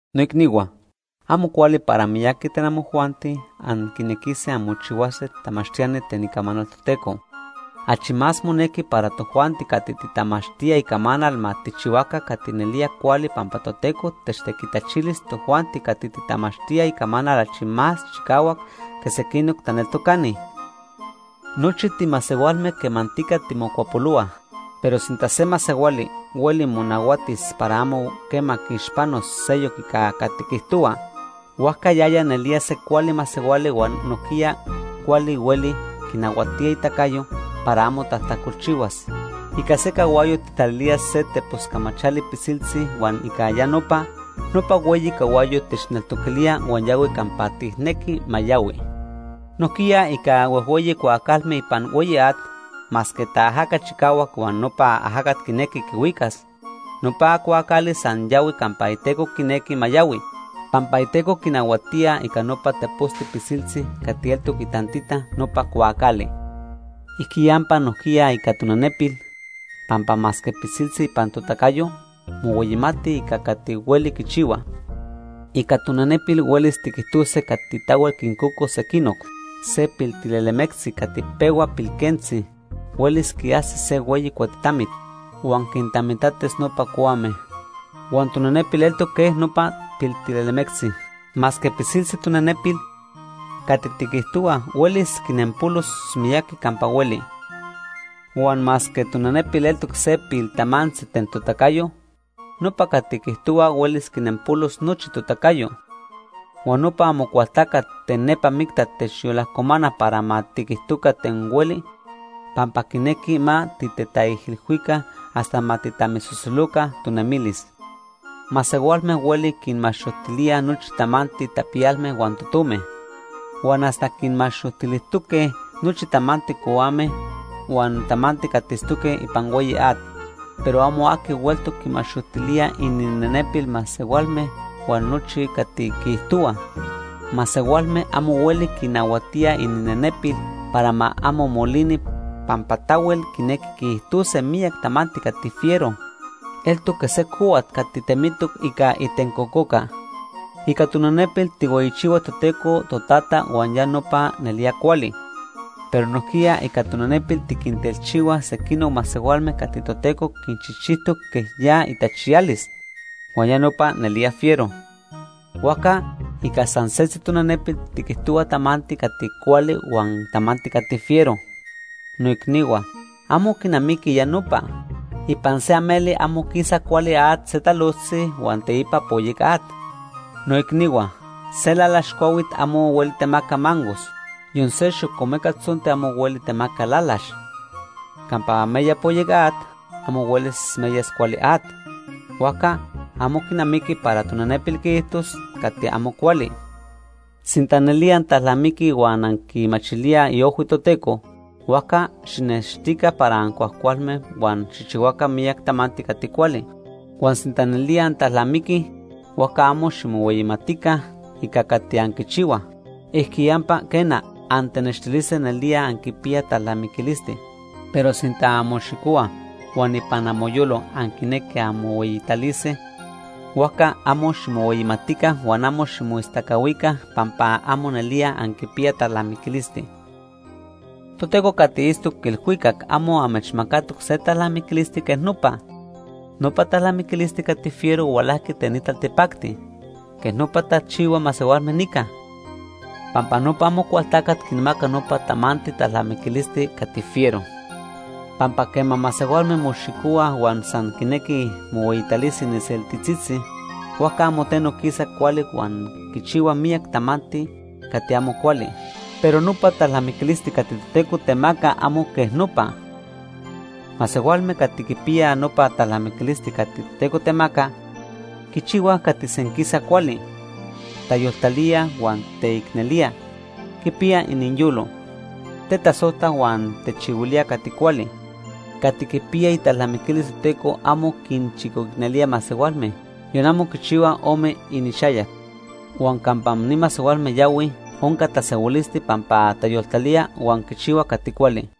Noicnihua, amo cuali para miyaqui ten amojuanti anquinequise anmochihuase tamachtiani ten Icamanal Toteco. Achi más monequi para tojuanti cati titamachtía Icamanal ma tijchihuaca cati nelía cuali pampa Toteco techtequitachilis tojuanti cati titamachtíaj Icamanal achi más chicahuac que sequinoc taneltocani. Nochi timasehualme quemantica timocuapolohuaj. Pero sinta se masehuali hueli monahuatis para amo quema quiixpanos seyoc ica cati quiijtohua, huajca yaya nelía se cuali masehuali huan nojquiya cuali hueli quinahuatía itacayo para amo tajtacolchihuas. Ica se cahuayo tijtalilíaj se tepos camachali pisiltzi huan ica ya nopa, nopa hueyi cahuayo techneltoquilía huan yahui campa tijnequij ma yahui. Nojquiya ica huejhueyi cuaacalme ipan hueyi at, masque taajaca chicahuac huan nopa ajacat quinequi quihuicas, nopa cuaacali san yahui campa iteco quinequi ma yahui, pampa iteco quinahuatía ica nopa teposti pisiltzi cati eltoc itantita nopa cuaacali. Ijquiyampa nojquiya ica tonenepil, pampa masque pisiltzi ipan totacayo, mohueyimati ica cati hueli quichihua. Ica tonenepil huelis tiquijtose cati tahuel quincocos sequinoc. Se piltilelemectzi cati pehua pilquentzi, huelis quiajsis se hueyi cuatitamit, huan quintamitatis nopa cuame. Huan tonenepil eltoc quej nopa piltilelemectzi. Masque pisiltzi tonenepil, cati tiquijtohuaj huelis quinnempolos miyaqui campa hueli. Huan masque tonenepil eltoc se piltamantzi ten totacayo, nopa cati quiijtohua huelis quinenpolos nochi totacayo. Huan nopa Amocualtacat ten nepa micta techyolajcomana para ma tiquijtoca ten hueli, pampa quinequi ma titetaijilhuica hasta ma tijtamisosoloca tonemilis. Masehualme huelij quinmaxojtilíaj nochi tamanti tapiyalme huan totome. Huan hasta quinmaxojtilijtoque nochi tamanti cohuame huan tamanti cati itztoque ipan hueyi at. Pero amo aqui hueltoc quimaxojtilía ininenepil masehualme huan nochi cati quiijtohuaj. Masehualme amo hueli quinahuatíaj ininenepil para ma amo molini pampa tahuel quinequij quiijtose miyac tamanti cati fiero. Eltoc quej se cohuat cati temitoc ica itencococa. Ica tonenepil tijhueyichihuaj Toteco Totata huan ya nopa nelía cuali, pero nojquiya ica tonenepil tiquintelchihuaj sequinoc masehualme cati Toteco quinchijchijtoc quej ya itachiyalis, huan ya nopa nelía fiero. Huajca ica san setzi tonenepil tiquijtohuaj tamanti cati cuali huan tamanti cati fiero. Noicnihua, amo quinamiqui ya nopa. Ipan se ameli amo quisa cuali at se talojtzi huan teipa poyec at. Noicnihua, se lalax cuahuit amo hueli temaca mangos. Yon se xocomeca tzonti amo hueli temaca lalax. Campa meya poyec at, amo huelis meyas cuali at. Huajca amo quinamiqui para tonenepil quiijtos cati amo cuali. Sinta nelía antalnamiquij huan anquimachilíaj iojhui Toteco, huajca xijnextica para ancuajcualme huan xijchihuaca miyac tamanti cati cuali. Huan sinta nelía antalnamiquij, huajca amo ximohueyimatica ica cati anquichihuaj. Ijquiyampa quena, antenextilise nelía anquipiyaj talnamiquilisti. Pero sinta anmoxicohuaj huan ipan amoyolo anquinequij anmohueyitalise, huajca amo ximohueyimatica huan amo ximoistacahuica pampa amo nelía anquipiyaj talnamiquilisti. Toteco cati itztoc ilhuicac amo amechmacatoc se talnamiquilisti quej nopa. Nopa talnamiquilisti cati fiero hualajqui ten ni taltipacti. Quej nopa tachihuaj masehualme nica, pampa nopa Amocualtacat quinmaca nopa tamanti talnamiquilis cati fiero. Pampa quema masehualme moxicohuaj huan san quinequi mohueyitalise iniseltitzitzi, huajca amo teno quisa cuali huan quichihuaj miyac tamanti cati amo cuali. Pero nopa talnamiquilisti cati Toteco temaca amo quej nopa. Masehualme cati quipiya nopa talnamiquilisti cati Toteco temaca, quichihuaj cati senquisa cuali. Tayoltalía huan teicnelía. Quipiyaj iniyolo. Tetasojtaj huan techihuilíaj cati cuali. Cati quipiyaj italnamiquilis Toteco amo quinchicoicnelíaj masehualme, yon amo quichihuaj ome inixayac. Huan campa ni masehualme yahuij onca tasehuilisti pampa tayoltalíaj quichihuaj cati cuali.